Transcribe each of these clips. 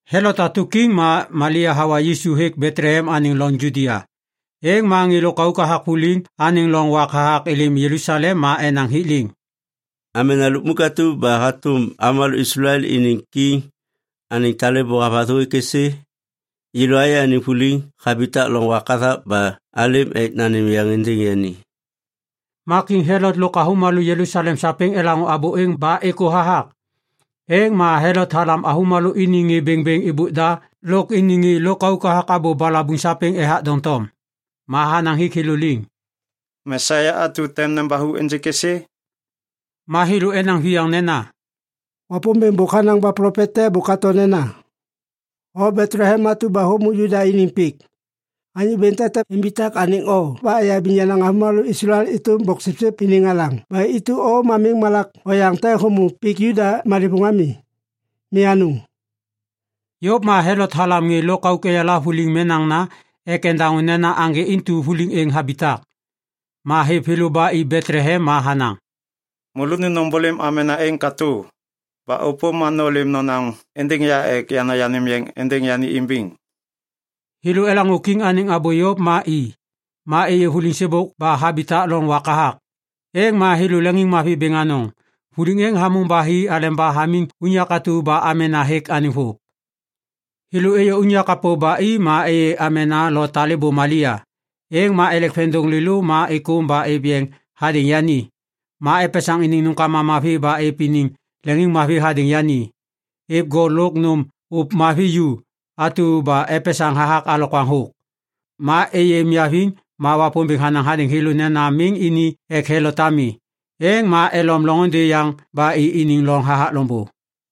Helot hatu kiŋ ma Malia hawa Yisu hêk Betlehem anêŋ loŋ Judia. Êŋ ma ŋê lôkauk hathak vuliŋ anêŋ loŋ wak hathak êlêm Jelusalem ma enaŋ hik liŋ, “Amena lukmuk atu ba hatu avômalô Islael iniŋ kiŋ, anêŋ talêbô havathu hêk êsê? Yêlô ayê anêŋ vuliŋ habitak loŋ wak hathak ba alêm ek nanêm yeŋ êndêŋ yani.” Ma kiŋ Helot lôk avômalô Jelusalem sapêŋ elaŋô abô êŋ ba êkô hathak. Êŋ ma Helot halam avômalô iniŋ ŋê bêŋbêŋ êbôk da lôk iniŋ ŋê lôkauk hathak abô balabuŋ sapêŋ ethak doŋtom. Ma hanaŋ hik thêlô liŋ, “Mesia atu tem nembathu ênjêk êsê?” Ma thêlô enaŋ viyaŋ nena, “Wapômbêŋ bôk hanaŋ ba plopet te bôk hato nena, “‘O Betlehem atu ba hômô Juda iniŋ pik, anyô bêŋ te tem imbitak anêŋ o ba eyabiŋ yenaŋ avômalô Islael êtôm boksipsip iniŋ alaŋ ba intu o miŋ malak oyaŋ te hômô pik Juda malêvôŋ ami. Mi anôŋ!’” Yôv ma Helot halam ŋê lôkauk eyala vuliŋ menaŋna ek endaŋô nena aŋgê intu vuliŋ êŋ habitak. Ma hêv thêlô ba i Betlehem ma hanaŋ, “Môlônu nômbôlêm amena êŋ katô. Ba ôpôm ma nôlêm nonaŋ êndêŋ ya ek yana yanêm yeŋ êndêŋ yani imbiŋ.” Thêlô elaŋô kiŋ anêŋ abô yôv ma i. Ma êyê vuliŋ sêbôk ba habitak loŋ wak hathak. Êŋ ma thêlô leŋiŋmavi bêŋ anôŋ. Vuliŋ êŋ hamôŋ ba hi aleba hamiŋ unyak atu ba amena hêk vôv. Thêlô êyô unyak kapô ba i ma êyê amena lo talêbô Malia. Êŋ ma elek veŋiŋdôŋ lêlô ba êkôm ba êv yeŋ hadêŋ yani. Ma epesaŋ iniŋ nômkama mavi ba êv iniŋ leŋiŋmavi hadêŋ yani. Êv gol lôk nôm ôv mavi ju atu ba epesaŋ hathak alokwaŋ thôk. Ma êyê niaviŋ ma Wapômbêŋ hanaŋ hadêŋ thêlô nena miŋ ini ek Helot ami. Êŋ ma elom loŋôndê yaŋ ba i iniŋ loŋ hathak loŋbô.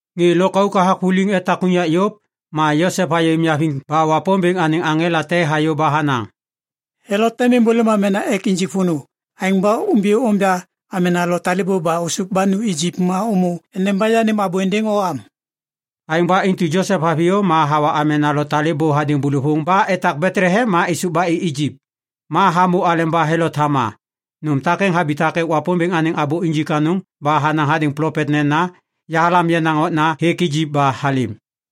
Ŋê lôkauk hathak vuliŋ etak unyak yôv, ma Josep hayê niaviŋ ba Wapômbêŋ anêŋ aŋela te hayô ba hanaŋ, “Helot tem êmbôlêm amena ek injik vônô. Aêŋ ba umbiyô onja amena lo talêbô ba ôsôv ba nu Ijip ma ômô endeba yanêm abô êndêŋ o am.” Aêŋ ba intu Josep haviyô ma hawa amena lo talêbô hadêŋ bôlôvôŋ ba etak Betlehem ma êsôv ba i Ijip ma hamô aleba Helot hama. Nôm takêŋ habitak ek Wapômbêŋ anêŋ abô injik anôŋ ba hanaŋ hadêŋ plopet nena, “Yahalam yenaŋ okna hêk Ijip ba halêm.”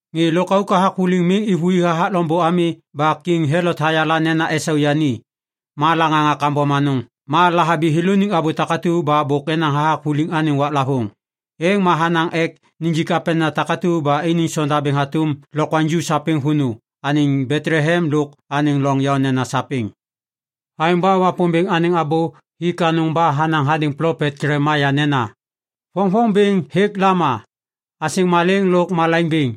Ŋê lôkauk hathak vuliŋ miŋ êvôi hathak loŋbô ami ba Kiŋ Helot hayala nena esau yani. Ma laŋaŋa kambom anôŋ ma lahabi thêlôniŋ abô takatu ba bôk enaŋ hathak vuliŋ anêŋ waklavôŋ. Êŋ ma hanaŋ ek nijik apenena takatu ba iniŋ sondabêŋ hatôm lokwaŋju sapêŋ vônô anêŋ Betlehem lôk anêŋ loŋ yaô nena sapêŋ. Aêŋ ba Wapômbêŋ anêŋ abô hik anôŋ ba hanaŋ hadêŋ plopet Jelemaia nena, “Voŋvoŋ bêŋ hêk Lama, asêŋ malêŋ lôk malaiŋ bêŋ,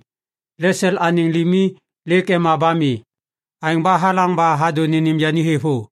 Lesel anêŋ limi lêk ema ba mi. Aêŋ ba halaŋ ba hadô nênêm yani thêvô.”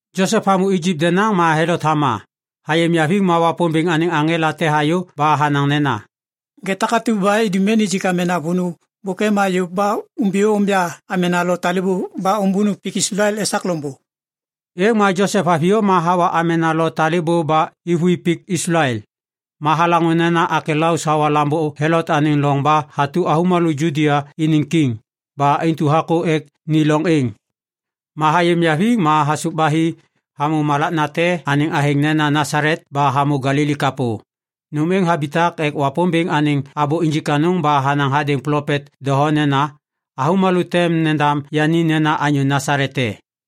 Josep hamô Ijip denaŋ ma Helot hama. Hayê niaviŋ ma Wapômbêŋ anêŋ aŋela te hayô ba hanaŋ nena, “Ŋê takatu ba idum ek nijik amena vônô bôk ema yôv ma umbiyô onja amena lo talêbô ba ômbônu pik Islael esak loŋbô.” Êŋ ma Josep haviyô ma hawa amena lo talêbô ba êvôi pik Islael. Ma halaŋô nena Akelaus hawa lambô Helot anêŋ loŋ ba hatu avômalô Judia iniŋ kiŋ. Ba intu hakô ek ni loŋ êŋ. Ma hayê niaviŋ ma hasôv ba hi hamô malak nate anêŋ athêŋ nena Nasalet ba hamô Galili kapô. Nom êŋ habitak ek Wapômbêŋ anêŋ abô injik anôŋ ba hanaŋ hadêŋ plopet doho nena, “Avômalô tem nendam yani nena anyô Nasalet te.”